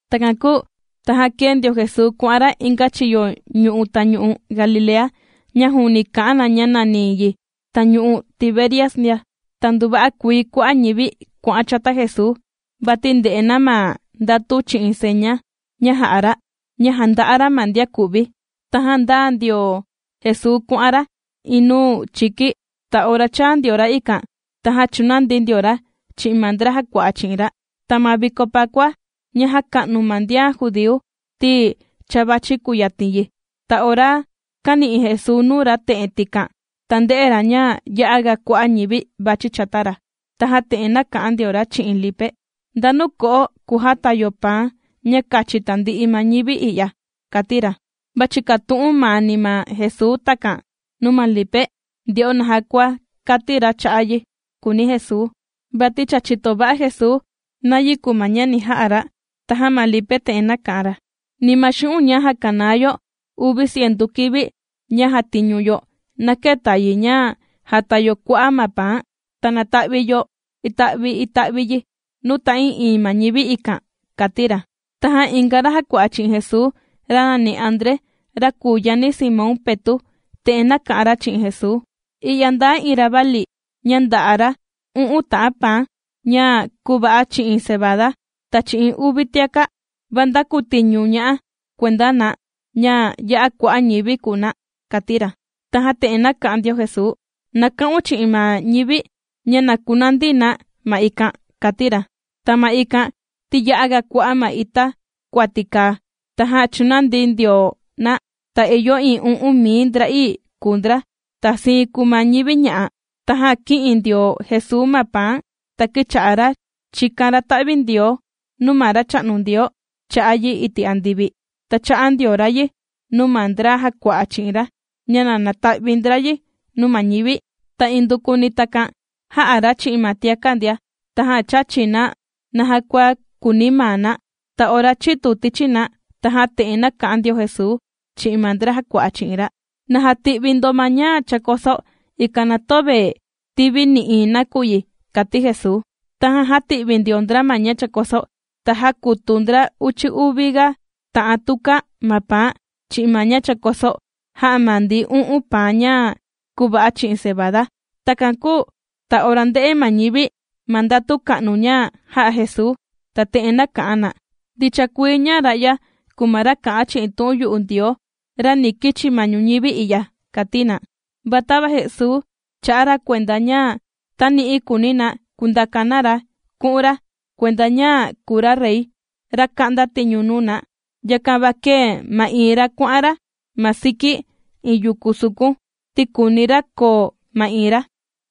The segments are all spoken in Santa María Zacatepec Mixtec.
Takan kūu tajan kēe ndio Jesuu kuà'an ra inga chiyo yu'u tañu'u Galilea, ña juuni kà'an na ña nàni yi tañu'u Tiberias ndia. Ta nduva'a kuii kua'a' ñivi kuà'an chata Jesuu, vati ndè'e na ma ndatu chi'in seña ña jà'a ra, ña jànda'a ra ma ndian ku'vi. Tajan ndāa ndio Jesuu kuà'an ra iin nuu chiki, ta ora chāa ndio ra ikan, tajan chūnandi ndio ra chi'in ma ndra jàkua'a chi'in ra. Ta ma viko Pakua ña jàka'nu ma ndian judíu ti cha vàchi kùyatin yi. Ta ora kāni'i Jesuu nuu ra te'en tikan, ta ndē'e ra ña ya'a ga kua'a' ñivi vàchi chata ra, tajan te'en nāka'an ndio ra chi'in Lipe: ―¿Ndanu ko'o kujata yo paan ña kachi tandi'i ma ñivi i'ya? ―kàti ra. Va chìkatu'un maani ma Jesuu takan nuu ma Lipe nde'o naja kua kati ra cha'a' yi, kùuni Jesuu, vati cha chìto va'a Jesuu nayi kùu ma ña ni ja'a ra. Tajan ma Lipe te'en nāka'an ra: ―Ni ma xu'un' ña jàkanaa yo uvi cientu kivi ña jàtiñu yo, na këta yi ña jàta yo kua'a' ma paan, ta nàta'vi yo ita'vi ita'vi yi nuu ta'ii'iin ma ñivi ikan ―kàti ra. Tajan inga ra jàkua'a chi'in Jesuu, ra nàni André, ra kùu yani Simón Petu', te'en nāka'an ra chi'in Jesuu: ―I'ya ndaa iin ravali, ña ndà'a ra u'un ta'an paan, ña kūva'a chi'in cebada, ta chi'in uvi tiaka'; ¿va ndakutiñu ña'a kuenda na, ña ya'a kua'a' ñivi kùu na? ―kàti ra. Tajan te'en nāka'an ndio Jesuu: ―Na ka'un chi'in ma ñivi, ña na kunandi na ma ikan ―kàti ra. Ta ma ikan ti ya'aga kua'a' ma ita kuati kàa, tajan chūnandi ndio na. Ta ìyo iin u'un mii ndra'ii kùu ndra. Ta siin kùu ma ñivi ña'a. Tajan kī'in ndio Jesuu ma paan, ta kīcha'a ra chìkan ra ta'vindioo, nuu ma Racha'nu Ndioo cha'a' yi iti' andivi, ta chā'a ndio ra yi nuu ma ndra jàkua'a chi'in ra, ña na nata'vi ndra yi nuu ma ñivi. Ta indukuni takan jā'a ra chi'in ma tiaka' ndia. Tajan chāchi na naja kua kùuni maa na. Ta ora chītu tichi na, tajan te'en nāka'an ndio Jesuu chi'in ma ndra jàkua'a chi'in ra: ―Na jati'vi ndo ma ña chākoso, ikan na töve tivi nï'iin nakuyi, ―kàti Jesuu. Tajan jāti'vi ndio ndra ma ña chākoso, ta jākutu ndra uchi uvi ga ta'an tuka ma paan chi'in ma ña chākoso jā'a ma ndi u'un paan ña kūva'a chi'in cebada. Takan kūu ta ora ndē'e ma ñivi ma ndatu ka'nu ña jā'a Jesuu, ta te'en nāka'an na: ―Ndicha kuii ña ra'ya kùu ma ra kà'an chi'in tu'un yu'u Ndioo, ra ni kichi ma ñuñivi i'ya ―kàti na. Va tava Jesuu chā'a ra kuenda ña tani'i kùuni na kundaka na ra ku'un ra, kuenda ña kùu ra rey, ra ka'nda tiñu nuu na. Yakan va kēe ma'iin ra kuà'an ra ma siki iin yuku sukun, ti kùuni ra koo ma'iin ra.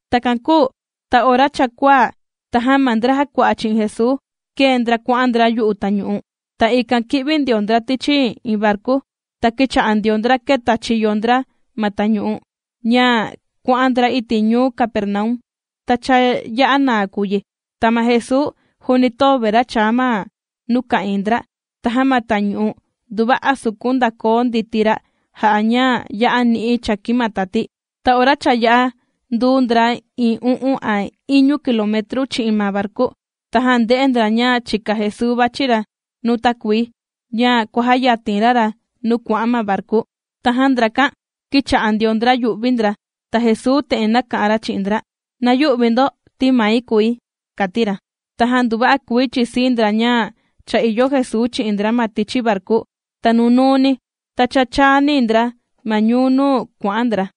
Takan kūu ta ora cha kuaa, tajan ma ndra jàkua'a chi'in Jesuu kēe ndra kuà'an ndra yu'u tañu'u. Ta ikan kī'vi ndio ndra tichi iin varku, ta kīcha'a ndio ndra kèta chiyo ndra ma tañu'u, ña kuà'an ndra iti' ñuu Capernaum. Ta cha ya'a naa kùu yi. Ta ma Jesuu juuni töve ra chàa ma nuu ka'ìin ndra. Tajan ma tañu'u, nduva'a sukun ndàkoo nditi ra' jà'a ña ya'a ni'i chàkin ma tati. Ta ora cha yā'a nduu ndra iin u'un a iñu kilometru chi'in ma varku, tajan ndē'e ndra ña chìka Jesuu vàchi ra nuu takuii, ña kuàjayatin ra ra nuu kuà'an ma varku. Tajan ndrakan kīcha'a ndio ndra yù'vi ndra. Ta Jesuu te'en nāka'an ra chi'in ndra: ―¡Na yü'vi ndo, ti mai kùi! ―kàti ra. Tajan nduva'a kuii chìsii ndra ña cha ìyo Jesuu chi'in ndra ma tichi varku. Ta nunuu ni, ta cha chàani ndra ma ñuu nuu kuà'an ndra.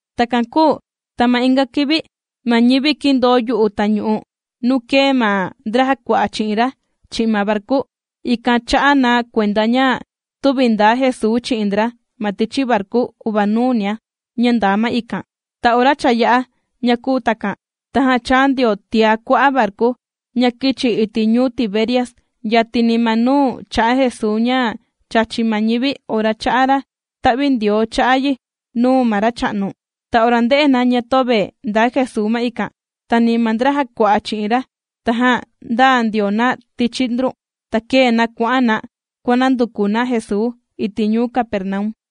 Takan kūu ta ma inga kivi, ma ñivi kīndoo yu'u tañu'u nuu kēe ma ndra jàkua'a chi'in ra chi'in ma varku, ikan chā'a na kuenda ña tüvi ndāa Jesuu chi'in ndra ma tichi varku uvanuu nia, ña ndaa ma ikan. Ta ora cha yā'a ña kūu takan, tajan chāa ndio tiá kua'a' varku, ña kīchi iti' ñuu Tiberias, yatini ma nuu chā'a Jesuu ña chàchi ma ñivi ora chā'a ra ta'vindioo cha'a' yi nuu ma Racha'nu. Ta ora ndē'e na ña töve ndaa Jesuu ma ikan, ta ni ma ndra jàkua'a chi'in ra, tajan ndāa ndio na tichi ndrun, ta kēe na kuà'an na kuànanduku na Jesuu iti' ñuu Capernaum.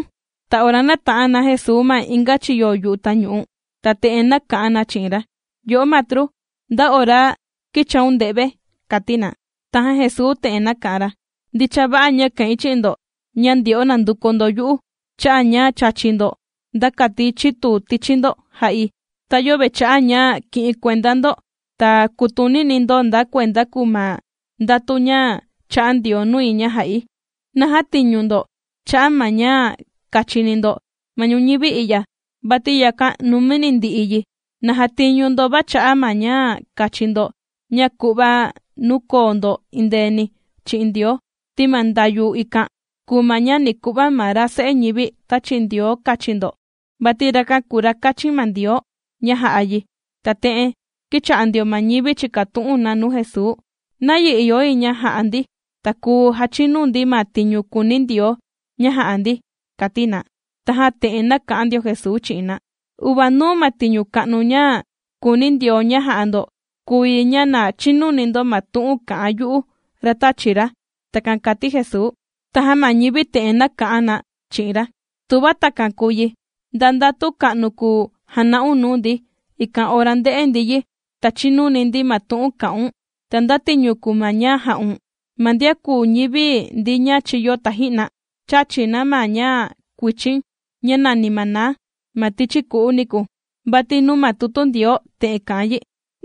Ta ora nāta'an na Jesuu ma inga chiyo yu'u tañu'u, ta te'en nāka'an na chi'in ra: ―Yo'o matru, ¿nda ora kīchaun nde've? ―kàti na. Tajan Jesuu te'en nāka'an ra: ―Ndicha va'a ña kà'in chi'in ndo, ña ndyo'o nànduku ndo yu'u, cha'a' ña chāchi ndo nda kati chitu tichi ndo jā'i, ta yöve cha'a' ña kì'in kuenda ndo, ta kùtunini ndo nda kuenda kùu ma ndatu ña chā'a Ndioo nui ña jà'i. Na jätiñu ndo cha'a' ma ña kachini ndo, ma ñuñivi i'ya, vati yakan numini ndi'i yi. Na jatiñu ndo va cha'a' ma ña kachi ndo, ña ku'va nuu koo ndo endeeni chi'in Ndioo. Ti ma ndayu ikan kùu ma ña ni ku'va ma ra Se'e ñivi tāchi Ndioo kachi ndo, vati rakan kùu ra kāchin ma Ndioo, ña jà'a ra yi. Ta te'en kīcha'a ndio ma ñivi chìkatu'un na nuu Jesuu: ―¿Nayi ìyo yi ña ja'a ndi, ta kùu jachinu ndi ma tiñu kùuni Ndioo ña ja'a ndi? ―kàti na. Tajan te'en nāka'an ndio Jesuu chi'in na: ―Uvanuu ma tiñu ka'nu ña kùuni Ndioo ña jà'a ndo, kùu yi ña na chinuni ndo ma tu'un kà'an yu'u, ra tāchi ra ―takan kàti Jesuu. Tajan ma ñivi te'en nāka'an na chi'in ra: ―Tuva takan kùu yi, ¿nda ndatu ka'nu kùu jana'un nuu ndi, ikan ora nde'e ndi yi, ta chininu ndi ma tu'un kà'un? ¿Ta nda tiñu kùu ma ña jà'un? Ma ndian kūu ñivi ndi ña chīyo taji'na, chāchi na ma ña kuichin ña nàni maná, ma tichi ku'u niku, vati nuu ma tutu Ndioo te'en kà'an yi: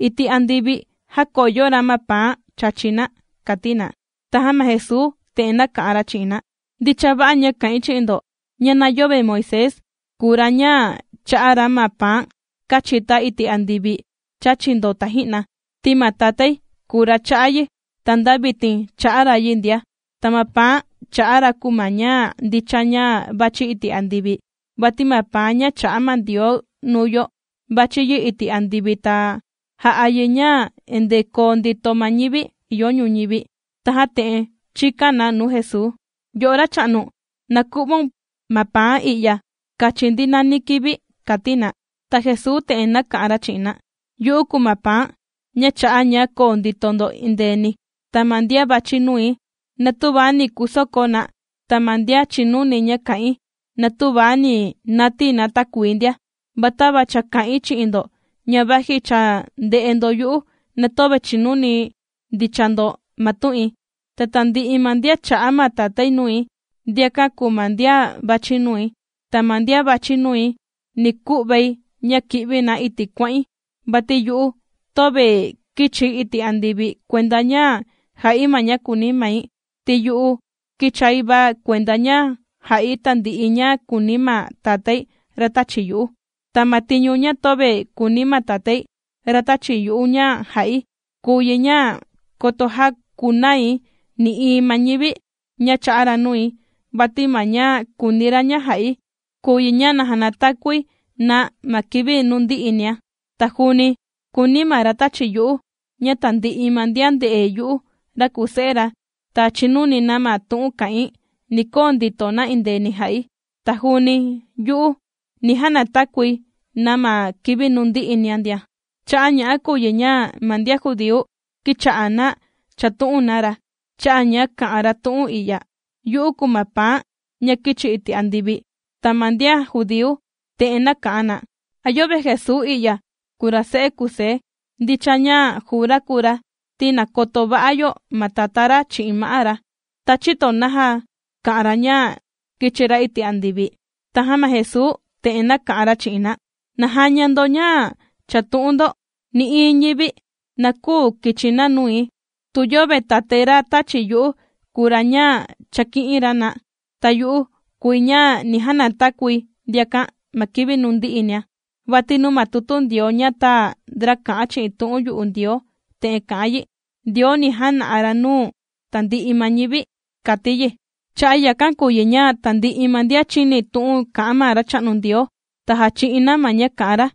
“Iti' andivi jākoyo ra ma paan chàchi na” ―kàti na. Tajan ma Jesuu te'en nāka'an ra chi'in na: ―Ndicha va'a ña kà'in chi'in ndo: ña na yöve Moisés kùu ra ña chā'a ra ma paan kāchita iti' andivi chāchi ndo taji'na, ti ma Tatái kùu ra chā'a yi ta nda vitin chà'a ra yi ndia. Ta ma paan chà'a ra kùu ma ña ndicha ña vàchi iti' andivi. Vati ma paan ña chà'a ma Ndioo nuu yo vàchi yi iti' andivi, ta jà'a yi ña endee koo ndito ma ñivi ìyo ñuñivi. Tajan te'en chīkan na nuu Jesuu: ―Yo'o Racha'nu, na ku'vaun ma paan i'ya kachi ndi nani kivi ―kàti na. Ta Jesuu te'en nāka'an ra chi'in na: ―Yu'u kùu ma paan ña chà'a ña koo ndito ndo endeeni. Ta ma ndian vàchi nui, na tüva ni kusoko na, ta ma ndian chìnuni ña kà'in, na tüva ni natii na takuii ndia. Va tava cha kā'in chi'in ndo, ña vaji cha ndè'e ndo yu'u, na töve chìnuni ndicha ndo ma tu'in. Ta tandi'i ma ndian chā'a ma Tatái nui, ndiakan kùu ma ndian vàchi nui. Ta ma ndian vàchi nui ni ku'vai ña ki'vi na iti' kuà'in. Vati yu'u töve kīchi̱ iti' andivi, kuenda ña jà'i ma ña kùuni mai, ti yu'u kīchai va kuenda ña jà'i tandi'i ña kùuni ma Tatái, ra tāchi yu'u. Ta ma tiñu ña töve kùuni ma Tatái, ra tāchi yu'u ña jà'i, kùu yi ña, koto jäkunai nï'iin ma ñivi ña chā'a ra nui, vati ma ña kùuni ra ña jà'i, kùu yi ña na janatakui na ma kivi nuu ndi'i nia. Ta juuni kùuni ma ra tāchi yu'u ña tandi'i ma ndian nde'e yu'u ra kùu Se'e ra, ta chinuni na ma tu'un kà'in, ni koo ndito na endeeni jà'i, ta juuni yu'u, ni janatakui na ma kivi nuu ndi'i nia ndia. Cha'a' ña'a kùu yi ña ma ndian judíu kīcha'a na chàtu'un na ra, cha'a' ña kā'an ra tu'un i'ya: “Yu'u kùu ma paan ña kīchi iti' andivi.” Ta ma ndian judíu te'en nāka'an na: ―¿A yöve Jesuu i'ya, kùu ra se'e Kusé? Ndicha ña juu ra kùu ra, ti nàkoto va'a yo ma tatá ra chi'in ma'á ra. ¿Ta chïto naja kà'an ra ña kīchi ra iti' andivi? Tajan ma Jesuu te'en nāka'an ra chi'in na: ―Na jaña ndo ña chàtu'un ndo. Nï'iin ñivi, na küu kichi na nui, tu yöve Tatái ra tāchi yu'u kùu ra ña chàki'in ra na. Ta yu'u kùi ña ni janatakui ndiakan ma kivi nuu ndi'i nia. Vati nuu ma tutu Ndioo ña tāa ndra kà'an chi'in tu'un yu'u Ndioo te'en kà'an yi: “Ndioo ni jana'a ra nuu tandi'i ma ñivi”, kàti yi. Cha'a' yakan kùu yi ña tandi'i ma ndian chìni tu'un kà'an ma Racha'nu Ndioo, ta jàchi'in na ma ña kà'an ra.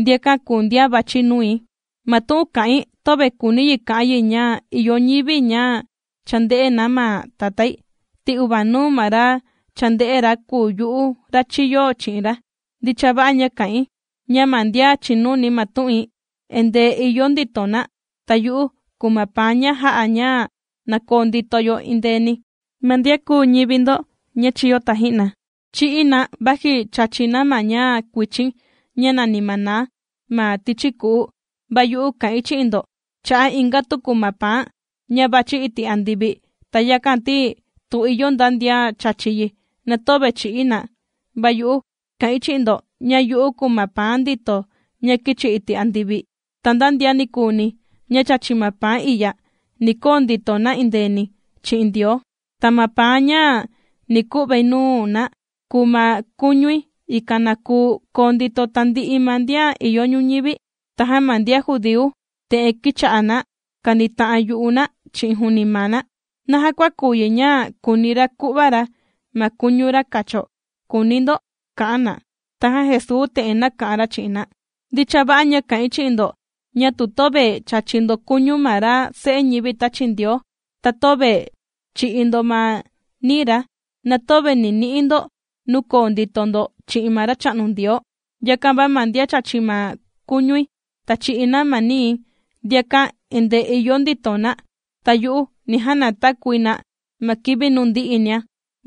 Ndiakan kùu ndian vàchi nui. ’Ma tu'un kà'in töve kùuni yi ka'an yi ña ìyo ñivi ña cha ndē'e na ma Tatái, ti uvanuu ma ra cha ndē'e ra, kùu yu'u, ra chīyo chi'in ra. Ndicha va'a ña kà'in, ña ma ndian chìnuni ma tu'in, endee ìyo ndito na. Ta yu'u kùu ma paan ña jà'a, ña na koo ndito yo endeeni. Ma ndian kūu ñivi ndo ña chīyo taji'na, chī'í na vaji chāchi na ma ña kuichin ña nàni maná, ma tichi ku'u. Va yu'u kà'in chi'in ndo, cha'a' inga tuku ma paan ña vàchi iti' andivi, ta yakan, ti tu ìyo nda ndian chàchi yi, na töve chì'í na. Va yu'u kà'in chi'in ndo ña yu'u kùu ma paan ndito ña kīchi iti' andivi, ta nda ndian nikuuni ña chàchi ma paan i'ya, ni koo ndito na endeeni chi'in Ndioo. Ta ma paan ña ni ku'vai nuu na kùu ma kuñui, ikan na kuu koo ndito tandi'i ma ndian ìyo ñuñivi. Tajan ma ndian judíu te'en kīcha'a na kànita'an yu'u na chi'in juuni maa na: ―¿Naja kua kùu yi, ña kùuni ra ku'va ra ma kuñu ra kacho?, kùuni ndo ―kà'an na. Tajan Jesuu te'en nāka'an ra chi'in na: ―Ndicha va'a ña kà'in chi'in ndo, ña tu töve chàchi ndo kuñu ma ra Se'e ñivi tāchi Ndioo, ta töve chì'i ndo ma nií ra, na töve ni ni'i ndo nuu koo ndito ndo chi'in ma Racha'nu Ndioo. Yakan va ma ndian chàchi ma kuñui, ta chì'i na ma nii̱, ndiakan endee ìyo ndito na, ta yu'u ni janatakui na ma kivi nuu ndi'i nia.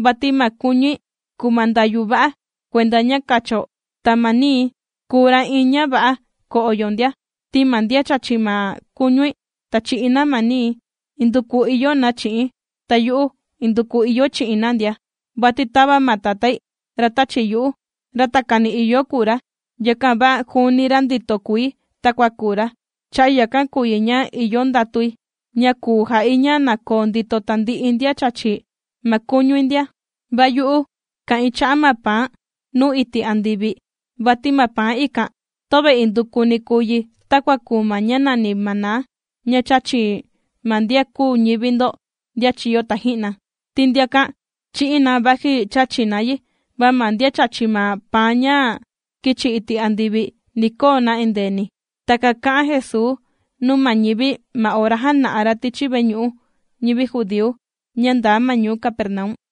Vati ma kuñui kùu ma ndayu va'a, kuenda ña kacho, ta ma nii̱ kùu ra' iin ña va'a ko'o yo ndia. Ti ma ndian chàchi ma kuñui, ta chì'i na ma nii̱, induku ìyo na chi'i̱n, ta yu'u, induku ìyoi chi'in na ndia. Vati tava ma Tatái, ra tāchi yu'u, ra takani ìyo kùu ra, yakan va juuni ra ndito kùi takua kùu ra, cha'a' yakan kùu yi ña ìyo ndatui ña kùu ja'i ña na koo ndito tandi'i ndian chàchi ma kuñui ndia. Va yu'u kà'in cha'a' ma paan nūu iti' andivi. Vati ma paan ikan töve indukuni kùu yi takua kùu ma ña nàni maná, ña chāchi ma ndian kūu ñivi ndo ndian chīyo taji'na, ti ndiakan chī'í na vaji chāchi na yi. Va ma ndian chàchi ma paan ña kīchi iti' andivi, ni koo na indeeni. Takan kā'an Jesuu nuu ma ñivi ma ora jāna'a ra tichi veñu'u ñivi judíu, ña ndaa ma ñuu Capernaum.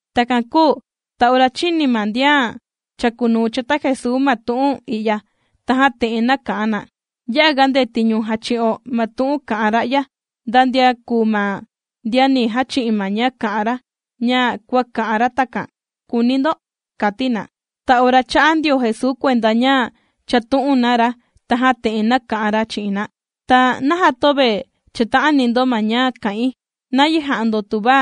Takan kūu ta ora chīni ma ndian chàkunuu chata Jesuu ma tu'un i'ya, tajan te'en nāka'an na: ―Ya'a ga ndetiñu jàchi'o ma tu'un kà'an ra'ya. ¿Nda ndian kùu ma ndian ni jachi'in ma ña kà'an ra, ña kua kà'an ra takan?, kùuni ndo ―kàti na. Ta ora chā'a ndio Jesuu kuenda ña chàtu'un na ra, tajan te'en nāka'an ra chi'in na: ―Ta, ¿naja töve chàta'ani ndo ma ña kà'in? ¿Nayi ja'a ndo, tuva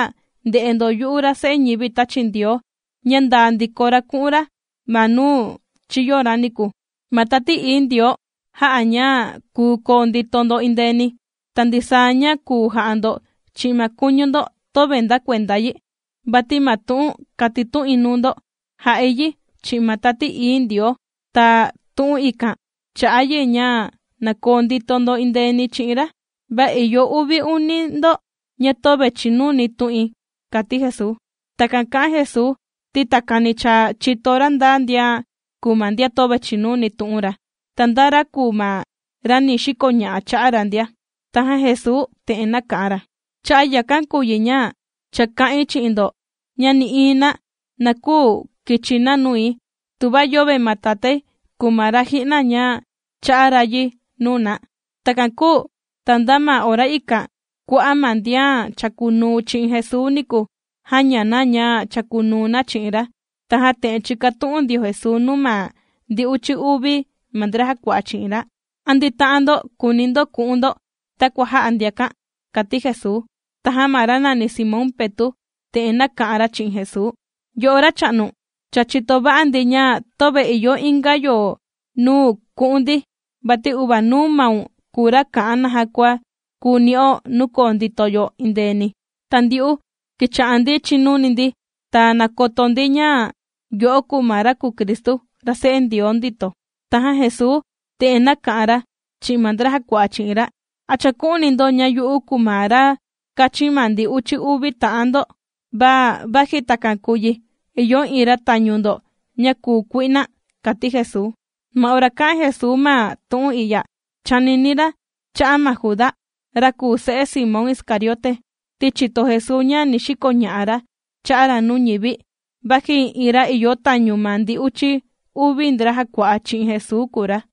nde'e ndo yu'u ra Se'e ñivi tāchi Ndioo, ña ndàa ndiko ra ku'un ra ma nuu chīyo ra niku? Ma Tati Ií Ndioo jà'a ña kùu koo ndito ndo endeeni, ta ndisaa ña kùu ja'a ndo chi'in ma kuñu ndo, töve nda kuenda yi. Vati ma tu'un kàtitu'in nuu ndo jà'i yi chi'in ma Tati Ií Ndioo. Ta tu'un ikan chà'a yi, ña na koo ndito ndo endeeni chi'in ra. Va ìyo uvi uni ndo ña töve chìnuni tu'in ―kàti Jesuu. Takan kà'an Jesuu, ti takani cha chìto ra nda ndian kùu ma ndian töve chìnuni tu'un ra, ta nda ra kùu ma ra ni xikoña'a cha'a' ra ndia. Tajan Jesuu te'en nāka'an ra: ―Cha'a' yakan kùu yi ña, cha kā'in chi'in ndo, ña nï'iin na, na küu kichi na nui, tuva yöve ma Tatái kùu ma ra ji'na ña chā'a ra yi nuu na. Takan kūu ta nda ma ora ikan, kua'a' ma ndian chàkunuu chi'in Jesuu niku, jāña na ña chàkunuu na chi'in ra. Tajan te'en chīkatu'un ndio Jesuu nuu ma ndi uchi uvi ma ndra jàkua'a chi'in ra: ―¿A ndita'an ndo kùuni ndo ku'un ndo, takua jā'a ndiakan? ―kàti Jesuu. Tajan ma ra nàni Simón Petu' te'en nāka'an ra chi'in Jesuu: ―Yo'o Racha'nu, cha chìto va'a ndi ña töve ìyo inga yo nuu ku'un ndi. Vati uvanuu maun kùu ra kà'an naja kua kùu ni'o nuu koo ndito yo endeeni. Ta ndyu'u kīcha'a ndi chìnuni ndi, ta nàkoto ndi, ña yo'o kùu ma ra kùu Cristu, ra Se'e Ndioo ndito. Tajan Jesuu te'en nāka'an ra chi'in ma ndra jàkua'a chi'in ra: ―¿A chàku'uni ndo ña yu'u kùu ma ra kāchin ma ndi uchi uvi ta'an ndo? Va vaji takan kùu yi, ìyo iin ra tañu ndo ña kùu kui'na ―kàti Jesuu. Ma ora kā'an Jesuu ma tu'un i'ya, chànini ra cha'a' ma Juda, ra kùu se'e Simón Iscariote, ti chìto Jesuu ña ni xikoña'a ra cha'a' ra nuu ñivi, vaji iin ra ìyo tañu ma ndi uchi uvi ndra jàkua'a chi'in Jesuu kùu ra.